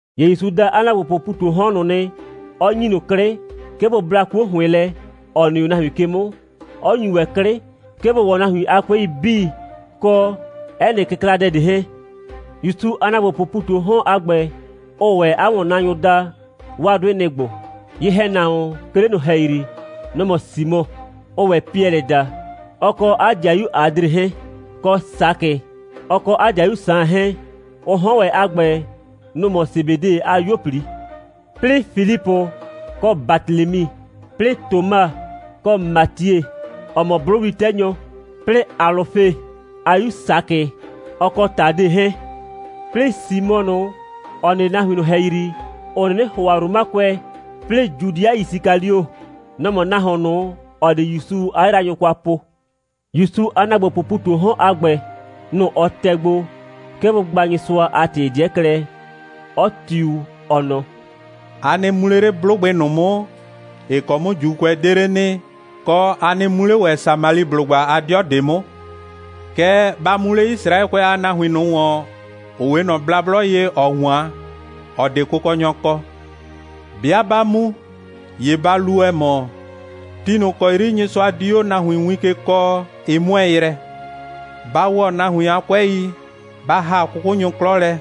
‑Ye ‑Yusu da 'a ‑naagbopʋʋ ‑pu ꞊tu 'o 'hɔn ꞊nʋ nɩ, 'ɔ ‑nyi ꞊nʋ 'klɩ, 'ke bʋ bla 'kuo ‑hʋɩn lɛ, ‑ɔ nɩ 'o nahuin ke 'mʋ, 'ɔ ‑nyu ‑wɛ 'klɩ, 'ke bʋ ‑wɔ nahuin a 'kʋɛi 'bii, kɔ 'ɛ nɩ kɩkladɛ ꞊de 'hɛɛn. ‑Yusu a ‑naagbopʋʋ ‑pu ꞊tu 'o 'hɔn a ‑gbɛ, ʋʋ ‑wɛ 'a ‑wɔnnaanyʋ daa, 'waa 'dʋɩ, nɩ‑ ‑gbo: Ye‑hɛnahuon, 'ke 'le ꞊nʋ ‑hɛyri, nɔ‑ mɔ Simɔ, ʋʋ ‑wɛ Piɛlɩ daa, ɔ kɔ 'a 'dɩayu Adre 'hɛɛn; kɔ Sakɩ, ɔ kɔ 'a 'dɩayu Saan 'hɛɛn; ʋ 'hɔn ‑wɛ a ‑gbɛ, nʋ‑ mɔ Sebede a 'yuo꞊pli; 'plɩɩ Filipʋ kɔ Batelemi; 'plɩɩ Toma kɔ Matie, ‑ɔ mɔ 'blʋwli'tɛnyɔ; 'plɩɩ Alʋfe a 'yu Sakɩ, ɔ kɔ Tade 'hɛɛn; 'plɩɩ Simɔ ꞊nʋ, ‑ɔ nɩ 'le nahuin ꞊nʋ ‑hɛyri, ‑ʋ 'nɩnɩ ‑hʋa Romakʋɛ; 'plɩɩ Judɩa Yisikalio. Nɔ‑ mɔ nahuon ꞊nʋ, ‑ɔ di ‑Yusu 'a yraanyʋ kwa po. ‑Yusu a ‑naagbopʋʋ ‑pu ꞊tu 'o 'hɔn a ‑gbɛ, nʋ‑ ɔ tɛ gbo, 'ke bʋ gba Nyɩsʋa a ‑tɩ 'dɩɛ klɛ, 'ɔ tiu, ɔ nɔ: «A nɩ mu 'le 'le 'blʋgbɩ ꞊nʋ 'mʋ, ‑ɩ ‑kɔ 'mʋ ‑Juukʋɛ 'de 'le nɩ, kɔ, a nɩ mu 'le ‑wɛ Samaliblʋgba a 'dɩɔ ꞊de 'mʋ. Kɛɛ, ba mu 'le Yisraɛkʋɛ a nahuin ꞊nʋ ‑wɔn, ‑ʋ 'we ꞊nɔ blablɔ ye, ‑ɔ 'wan, ‑ɔ 'de kʋkɔnyɔ kɔ. 'Bɩa 'ba mu, ‑ye ba lu, ‑ɛ mɔ: Ti ꞊nʋ ‑kɔ 'yri Nyɩsʋa di 'o nahuin win ke kɔɔ, ɩ 'mʋɛɛ yrɛ. Ba ‑wɔ nahuin a 'kʋɛi, ba ‑ha 'kʋkʋnyʋ 'klɔ lɛ,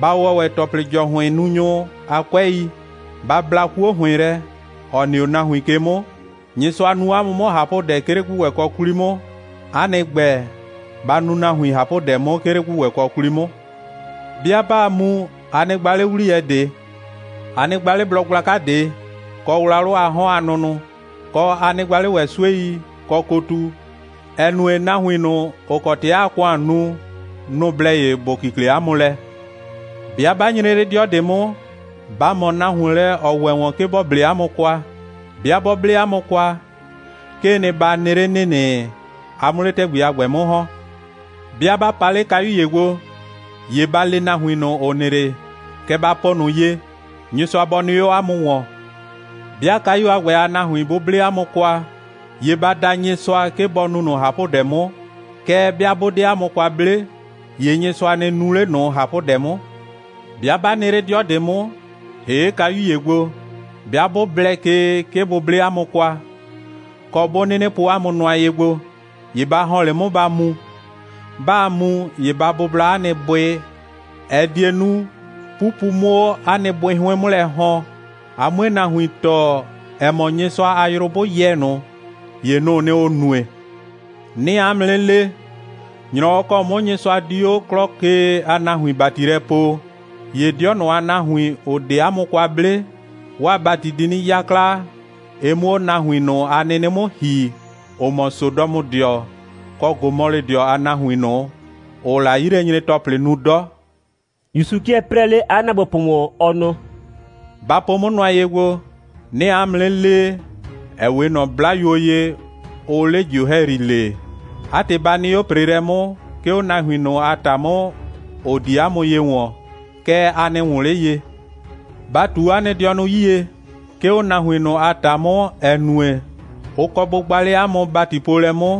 ba ‑wɔ ‑wɛ ‑tɔplɩ‑jɔhʋɩnnunyʋ a 'kʋɛi, ba bla 'kuo ‑hʋɩn lɛ, ‑ɔ nɩ 'o nahuin ke 'mʋ. Nyɩsʋa nu 'a mʋ 'mʋ ꞊hapʋdɛ, 'ke 'le ‑gbʋgbɛkɔ 'kwli 'mʋ. 'A nɩ ‑gbɛ, ba nu nahuin ꞊hapʋdɛ 'mʋ, 'ke 'le ‑gbʋgbɛkɔ 'kwli 'mʋ! 'Bɩa 'baa mu, a nɩ gba 'le 'wliyɛ ꞊de. A nɩ gba 'le blɔ gblaka ꞊de, kɔ wlawlʋ a 'hɔn a nʋnʋ, kɔ, a nɩ gba 'le ‑wɛ 'suei, kɔ kotu, ‑ɛ nue, nahuin ꞊nʋ, ‑ʋ kɔ ‑tɩ aa ‑kʋan nu, nʋ‑ blɛ ye ‑bʋ kikle 'a mʋ lɛ. 'Bɩa 'ba nyre 'le 'dɩɔ ꞊de 'mʋ, ba ꞊mɔ nahuon lɛ, ‑ɔ ‑wɛ ‑wɔn, 'ke ‑bɔ 'ble 'a mʋ kwa. 'Bɩa 'bɔ 'ble 'a mʋ kwa, 'kee nɩ, ba nɩ 'le ‑nɩnɩ, a 'mʋ 'le ‑tɛgbi a ‑gbɛ 'mʋ ‑hɔn. 'Bɩa 'ba pa 'le kayu ‑ye gbo, ‑ye ba le nahuin ꞊nʋ, ‑ʋ nɩ 'le, kɛ ba po ꞊nʋ ye: Nyɩsʋa bɔ nɩ 'o 'a mʋ ‑wɔn! 'Bɩa kayu a ‑gbɛ a nahuin 'bʋ 'ble 'a mʋ kwa, ‑ye ba da Nyɩsʋa, 'ke bɔ nu ꞊nʋ ꞊hapʋdɛ 'mʋ, kɛɛ, 'bɩa 'bʋ 'de 'a mʋ kwa 'ble, ‑ye Nyɩsʋa nɩ nu 'le ꞊nʋ ꞊hapʋdɛ 'mʋ. 'Bɩa 'ba nɩ 'le 'dɩɔ ꞊de 'mʋ, ‑hee' kayu ‑ye gbo, 'bɩa 'bʋ blɛ ke, 'ke bʋ 'ble 'a mʋ kwa, kɔ, 'bʋ 'nɩnɩ po 'a mʋ nʋa ye gbo, ‑ye ba ‑hɔn 'le 'mʋ, ba mu. 'Baa mu, ‑ye ba bʋbla 'a nɩ bʋɩ, ‑ɛ die nu, 'pupu 'mʋ 'o 'a nɩ bʋɩ 'hʋɩn 'mʋ lɛ ‑hɔn, a 'mue nahuin tɔɔ, ‑ɛ mɔ, Nyɩsʋa a yrʋ 'bʋ yɛ ꞊nʋ, ‑ye nʋ‑ʋ nɩ, ‑ʋ nue. 'Nɩɩ 'a mʋ 'nɩ le, ‑nyrɔwɔ ‑kɔ 'mʋ Nyɩsʋa di 'o 'klɔ ke a nahuin ‑bati lɛ poo, ‑ye 'dɩɔ ꞊nʋ a nahuin, ‑ʋ 'de 'a mʋ kwa 'ble, 'waa ‑bati di 'nɩ 'yakla, ɩ 'mʋ 'o nahuin ꞊nʋ a nɩnɩ 'mʋ ‑hi, ‑ʋ mɔ Sodɔmʋdɩɔ kɔ Gomɔlɩdɩɔ a nahuin ꞊nʋ, ‑ʋʋ la 'yilɛnyre‑tɔplɩ nu 'dɔ.» (‑Yusu 'kɩɛ 'prɛɛ 'le 'a ‑naagbopʋ ‑wɔn, ɔ nɔ:) «Ba po 'mʋ nʋa ye gbo. 'Nɩɩ 'a mʋ 'nɩ lee, ‑ɛ 'we ꞊nɔ 'blayuo ye, ʋʋ 'le ‑jio ‑hɛyri lee. 'A ‑tɩ, ba nɩ 'o ‑preelɛ 'mʋ, 'ke 'o nahuin ꞊nʋ a ‑ta 'mʋ, ‑ʋ di 'a mʋ ye ‑wɔn, kɛɛ, a nɩ ‑wʋn 'le ye. Ba ꞊tu 'a nɩ dɩɔnʋ 'yie, 'ke 'o nahuin ꞊nʋ a ‑ta 'mʋ, ‑ɛ nue, ʋ kɔ bʋ gba 'le 'a mʋ ‑batipoolɛ 'mʋ,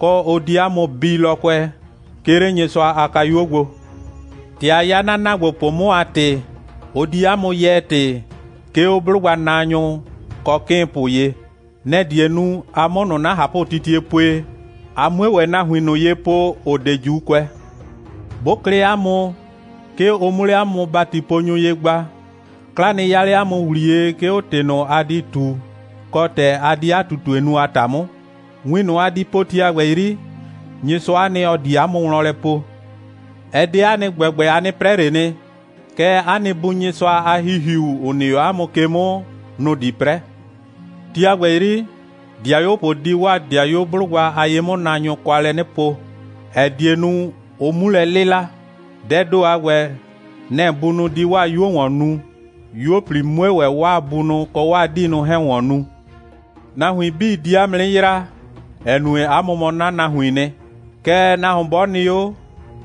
kɔ, ʋ di 'a mʋ bii lɔkʋɛ, 'ke 'le Nyɩsʋa a kayuo gbo. ‑Tɛ a 'ya 'na ‑naagbopʋ 'mʋ a ‑tɩ, ʋ di 'a mʋ yɛɛ ‑tɩ, 'ke 'o 'blʋgbanaanyʋ kɔ 'kɩɩnpʋ ye. Nɛ‑ die nu, a 'mʋ ꞊nʋ 'na ꞊hapʋtitie pue, a 'mue ‑wɛ nahuin ꞊nʋ ye po, ‑ʋ 'de ‑Juukʋɛ. 'Bʋ klɩ 'a mʋ, 'ke ʋ 'mʋ 'le 'a mʋ ‑batiponyʋ ye gba, 'kla nɩ 'ya 'le 'a mʋ ‑wliye, 'ke 'o ‑tɩ ꞊nʋ, a di ꞊tu, kɔ, ‑tɛ a di 'a ꞊tutue nu a ‑ta 'mʋ. Win ꞊nʋ, a di po, ti a ‑gbɛ 'yri, Nyɩsʋa'a nɩ, ‑ɔ di 'a mʋ wlɔn lɛ po. Ɛ 'de 'a nɩ ‑gbɛgbɛ, a 'nɩ 'prɛ ꞊le nɩ. Kɛɛ, 'a nɩ Bu Nyɩsʋa a ‑Hihiu, ‑ʋ nɩ 'o 'a mʋ ke 'mʋ, nʋ‑ di 'prɛ. Ti a ‑gbɛ 'yri, 'dɩayuopʋ di 'waa 'dɩayuo 'blʋgba a ye'mʋnaanyʋ kwa lɛ 'nɩ po, ‑ɛ die nu, ʋ 'mu lɛ 'lɩla. Dɛɛ ‑do a ‑gbɛ, nɛ‑ bunʋ di 'waa 'yuo ‑wɔn nu, 'yuo꞊pli 'mue ‑wɛ 'waa bunʋ kɔ 'waa 'diinʋ 'hɛɛn ‑wɔn nu. Nahuin 'bii di 'a mʋ 'nɩ yraa, ‑ɛ nue, 'a mʋ mɔ 'na nahuiin nɩ. Kɛɛ, nahuon 'bɔ nɩ 'o,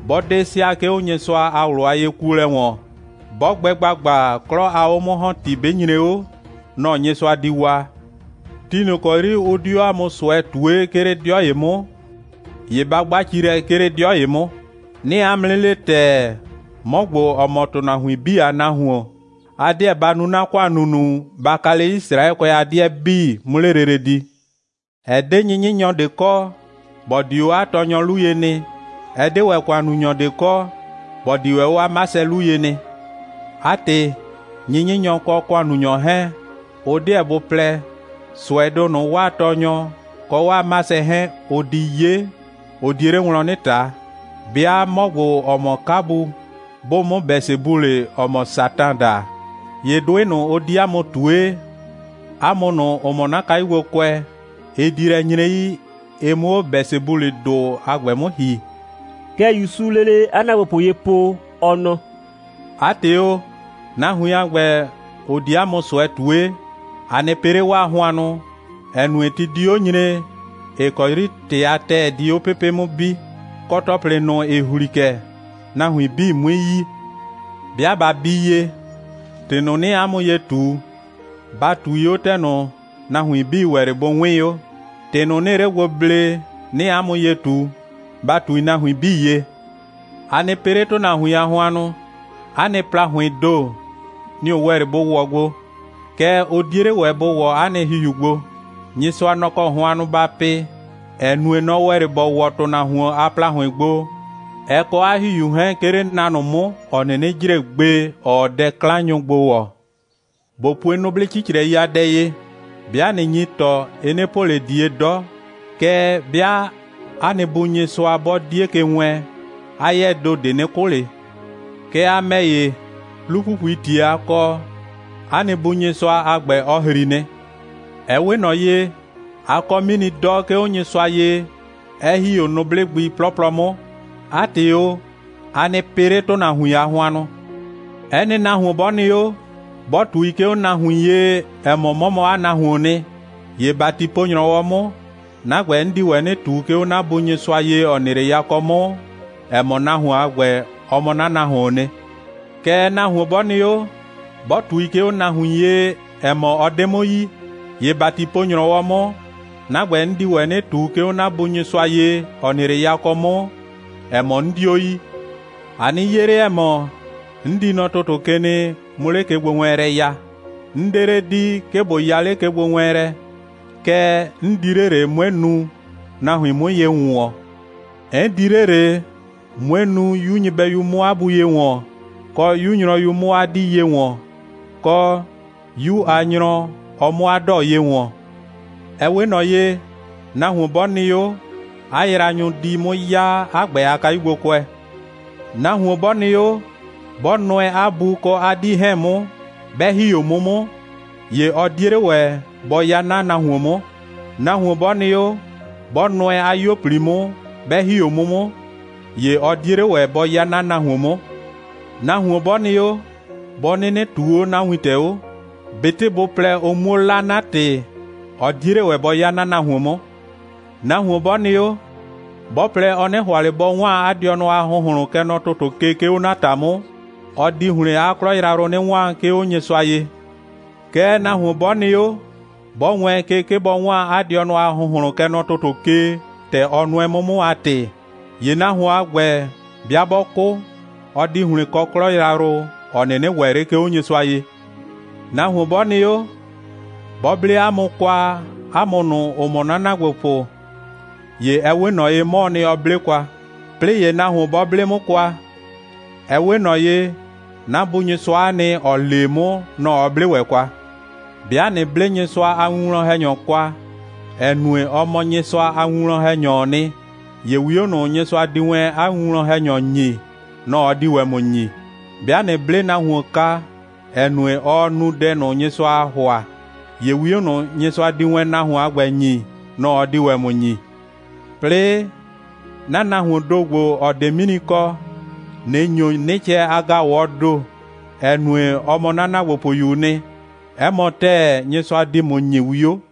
'bɔ 'de sɩa, 'ke 'o Nyɩsʋa a ꞊wlʋ a yekuolɛ ‑wɔn, 'bɔ gbɛ ‑gbagba, 'klɔ a 'o'mʋ‑hɔnti 'bɩ nyre 'o, nɔ‑ Nyɩsʋa di waa. Ti ꞊nʋ ‑kɔ 'yri ʋ di 'o 'a mʋ ꞊sʋɛ ꞊tue, 'ke 'le 'dɩɔ ‑ye 'mʋ, ‑ye ba 'gba ci lɛ, 'ke 'le 'dɩɔ ‑ye 'mʋ. 'Nɩɩ 'a mʋ 'nɩ le ‑tɛɛ, 'mɔ ‑gbo, ‑ɔ mɔ ‑tʋnahuin 'bii a Nahuon, a 'deɛ ba nu 'na ‑kʋan ‑nunu, ba ka 'le Yisraɛkʋɛ a 'dɩɛ 'bii, 'mʋ 'le lele di. Ɛ 'de 'nyɩnyɩnyɔ ꞊de kɔ, ‑bɔ di 'o 'a tɔɔnyɔ 'lu ye nɩ. Ɛ 'de ‑wɛ ‑kʋannunyɔ ꞊de kɔ, ‑bɔ di ‑wɛ 'o 'a 'masɛ 'lu ye nɩ. 'A ‑tɩ, 'nyɩnyɩnyɔ kɔ ‑kʋannunyɔ 'hɛɛn, ʋ 'deɛ bʋ plɛ, ꞊sʋɛdʋ ꞊nʋ, 'waa tɔɔnyɔ kɔ 'waa 'masɛ 'hɛɛn, ʋ di 'ye, ʋ die 'le wlɔn 'nɩ ꞊ta. 'Bɩa 'mɔ ‑gbo, ‑ɔ mɔ 'kabu, 'bʋʋ 'mʋ Bɛsebulɩ (‑ɔ mɔ Satan) daa, ‑ye 'dʋɩ ꞊nʋ, ʋ di 'a mʋ ꞊tue, 'a mʋ ꞊nʋ, ‑ʋ mɔ 'na kayugbokʋɛ, ɩ di lɛ nyre 'yi, ɩ 'mʋ 'o Bɛsebulɩdʋ a ‑gbɛ 'mʋ ‑hi.» (Kɛ ‑Yusuu lele 'a ‑naagbopʋ ye po, ɔ nɔ:) «'A ‑tɩ o, nahuin a ‑gbɛ, ‑ʋ di 'a mʋ ꞊sʋɛ ꞊tue, a nɩ pɩ 'le 'waa hʋannʋ, ‑ɛ nue, ti di 'o 'nɩ nyre, ‑ɩ kɔ 'yri ‑tɩ a ‑tɛɛ di 'o pepe' 'mʋ bi, kɔ, ‑tɔplɩ ꞊nʋ, ‑ɩ ‑hli kɛ, nahuin 'bii 'mui yi. 'Bɩa ꞊ba bii ye, ‑tɩ ꞊nʋ, 'nɩɩ 'a mʋ ye ꞊tu, ba ꞊tui 'o ‑tɛ ꞊nʋ, nahuin 'bii ‑wɛ 'le bʋ 'wɩɩn 'o. ‑Tɩ ꞊nʋ, 'nɩɩ 'le gbo blee, 'nɩɩ 'a mʋ ye ꞊tu, ba ꞊tui nahuin 'bii ye. A nɩ pɩ 'le ‑tʋnahuin a hʋannʋ. 'A nɩ ‑plahʋɩɩn ‑do, nɩ‑ ʋ ‑wɛ 'le bʋ ‑wɔ gbo. Kɛɛ, ʋ 'die 'le ‑wɛ bʋ ‑wɔ 'a nɩ ‑hihiu gbo. Nyɩsʋa, nɔ‑ kɔ hʋannʋ ba pɩ, ‑ɛ nue, nɔ‑ ‑wɛ 'le ‑bɔ ‑wɔ ‑tʋnahuon a ‑plahʋɩn gbo, ɛ kɔ 'a ‑hihiu 'hɛɛn, 'ke 'le na ꞊nʋ 'mʋ, ‑ɔ 'nɩnɩ jre gbe, ‑ɔɔ dɛ'klannunyʋ gbo ‑wɔ. ꞊Bo pue nʋblɩ 'cicrɛi a dɛ ye: 'Bɩa ꞊nɩ nyi ‑tɔ, ɩ 'nɩ po ꞊le ꞊die 'dɔ, kɛɛ, 'bɩa 'a nɩ Bu Nyɩsʋa 'bɔ 'die ke wɛɛn, 'a 'yɛɛ ‑do ꞊de 'nɩ 'kʋ ꞊le. Kɛɛ, a ‑mɛ ‑ye, 'lu‑pupuii ‑tie a kɔ, 'a nɩ Bu Nyɩsʋa a ‑gbɛ, ɔ ‑hri nɩ. Ɛ 'we ꞊nɔ ye, a kɔ 'mini 'dɔ, 'ke 'o Nyɩsʋa ye, 'ɛ ‑hi 'o nʋblɩ gbi 'plɔplɔ ꞊nʋ 'mʋ. 'A ‑tɩ o, a nɩ pɩ 'le ‑tʋnahuin a hʋannʋ!» «'Ɛ nɩ nahuon 'bɔ nɩ 'o, 'bɔ ꞊tui, 'ke 'o nahuin ye, ‑ɛ mɔ, ɔ mɔ 'na nahuoon nɩ, ‑ye ‑batipo‑nyrɔwɔ 'mʋ, 'na ‑gbɛ, 'n di ‑wɛ 'nɩ ꞊tu, 'ke 'o 'na Bu Nyɩsʋa ye, ‑ɔ nɩ 'le yakɔ 'mʋ, ‑ɛ mɔ, nahuon a ‑gbɛ, ɔ mɔ 'na nahuoon nɩ. Kɛɛ, nahuon 'bɔ nɩ 'o, 'bɔ ꞊tui, 'ke 'o nahuin ye, ‑ɛ mɔ, ɔ 'de 'mʋ yi, ‑ye ‑batipo‑nyrɔwɔ 'mʋ, 'na ‑gbɛ, 'n di ‑wɛ 'nɩ ꞊tu, 'ke 'o 'na Bu Nyɩsʋa ye, ‑ɔ nɩ 'le yakɔ 'mʋ, ‑ɛ mɔ, 'n 'dio yi.» «A nɩ 'ye 'le, ‑ɛ mɔ, 'n di nɔ ‑tʋtʋ ke nɩ, 'mʋ 'le kegbowɛɛnlɛ ya. 'N 'de 'le di, 'ke ꞊bo ya 'le kegbowɛɛnlɛ, kɛɛ, 'n di 'le ꞊le, 'mue nu, nahuin 'mʋ ye ‑wʋnwɔn. 'N di 'le ꞊le, 'mue nu, 'yu nyɩbɛyu 'mʋ 'a bu ye ‑wɔn, kɔ, 'yu nyrɔyu, ɔ 'mʋ 'a 'dii ye ‑wɔn, kɔ, 'yu a nyrɔ, ɔ 'mʋ 'a 'dɔɔ ye ‑wɔn. Ɛ 'we ꞊nɔ ye, nahuon 'bɔ nɩ 'o, 'a yraanyʋ di 'mʋ 'ya 'a ‑gbɛ a kayugbokʋɛ. Nahuon 'bɔ nɩ 'o, 'bɔ nʋɛ 'a bu kɔ 'a 'dii 'hɛɛn 'mʋ, 'bɛ ‑hi 'o 'mʋ 'mʋ, ‑ye ɔ 'die 'le ‑wɛ bɔ 'ya 'na nahuon 'mʋ. Nahuon 'bɔ nɩ 'o, 'bɔ nʋɛ 'a 'yuo꞊pli 'mʋ, 'bɛ ‑hi 'o 'mʋ 'mʋ, ‑ye ɔ 'die 'le ‑wɛ bɔ 'ya 'na nahuon 'mʋ. Nahuon 'bɔ nɩ 'o, 'bɔ 'nɩnɩ ꞊tuu 'o 'na wintɛ 'o, ꞊betɩ bʋ plɛ, ʋ 'muo 'la 'na ‑tɩ, ɔ 'die 'le ‑wɛ bɔ 'ya 'na nahuon 'mʋ. Nahuon 'bɔ nɩ 'o, 'bɔ plɛ, ɔ 'nɩ ‑hʋa ꞊le bɔ 'waan 'a dɩɔnʋ a ‑hʋnhlʋn, kɛ nɔ ‑tʋtʋ ke, 'ke 'o 'na ‑ta 'mʋ, ɔ di ‑hlɩn 'a 'klɔ yrayrʋ 'nɩ 'waan, 'ke 'o Nyɩsʋa ye. Kɛɛ, nahuon 'bɔ nɩ 'o, 'bɔ wɛɛn ke, 'ke bɔ 'waan 'a dɩɔnʋ a ‑hʋnhlʋn, kɛ nɔ ‑tʋtʋ ke, ‑tɛ ɔ nʋɛ 'mʋ 'mʋ a ‑tɩ, ‑ye nahuon a ‑gbɛ, 'bɩa 'bɔ 'kʋ, ɔ di ‑hlɩn kɔ 'klɔ yrayrʋ, ‑ɔ 'nɩnɩ ‑wɛ 'le, 'ke 'o Nyɩsʋa ye.» «Nahuon 'bɔ nɩ 'o, 'bɔ 'ble 'a mʋ kwa, 'a mʋ ꞊nʋ, ‑ʋ mɔ 'na ‑naagbopʋ, ‑ye ɛ 'we ꞊nɔ ye, 'mɔɔ nɩ, ɔ 'ble kwa. 'Plɩɩ ‑ye nahuon 'bɔ 'ble 'mʋ kwa, ɛ 'we ꞊nɔ ye, 'na Bu Nyɩsʋa'a nɩ, ‑ɔ lee 'mʋ, nɔ‑ ɔ 'ble ‑wɛ kwa. 'Bɩa ꞊nɩ 'ble Nyɩsʋa a winwlɔn‑hɛnyɔ kwa, ‑ɛ nue, ɔ mɔ Nyɩsʋa a winwlɔn‑hɛnyɔɔ nɩ, ‑ye 'wio ꞊nʋ, Nyɩsʋa di wɛn 'a winwlɔn‑hɛnyɔ ‑nyi, nɔ‑ ɔ di ‑wɛ ‑mʋ ‑nyi. 'Bɩa ꞊nɩ 'ble nahuon kwa, ‑ɛ nue, ɔɔ nu dɛ ꞊nʋ, Nyɩsʋaa ‑hʋa, ‑ye 'wio ꞊nʋ, Nyɩsʋa di wɛn nahuon a ‑gbɛ ‑nyi, nɔ‑ ɔ di ‑wɛ ‑mʋ ‑nyi. 'Plɩɩ, 'na nahuoon ‑do ‑gbo, ‑ɔ 'de 'mini kɔ, ꞊nɩ ‑nyo 'nɩcɛ a ‑gaʋwɔɔ ‑do, ‑ɛ nue, ɔ mɔ 'na ‑naagbopʋyuu nɩ, 'ɛ mɔ ‑tɛɛ, Nyɩsʋa di ‑mʋ ‑nyi 'wio.»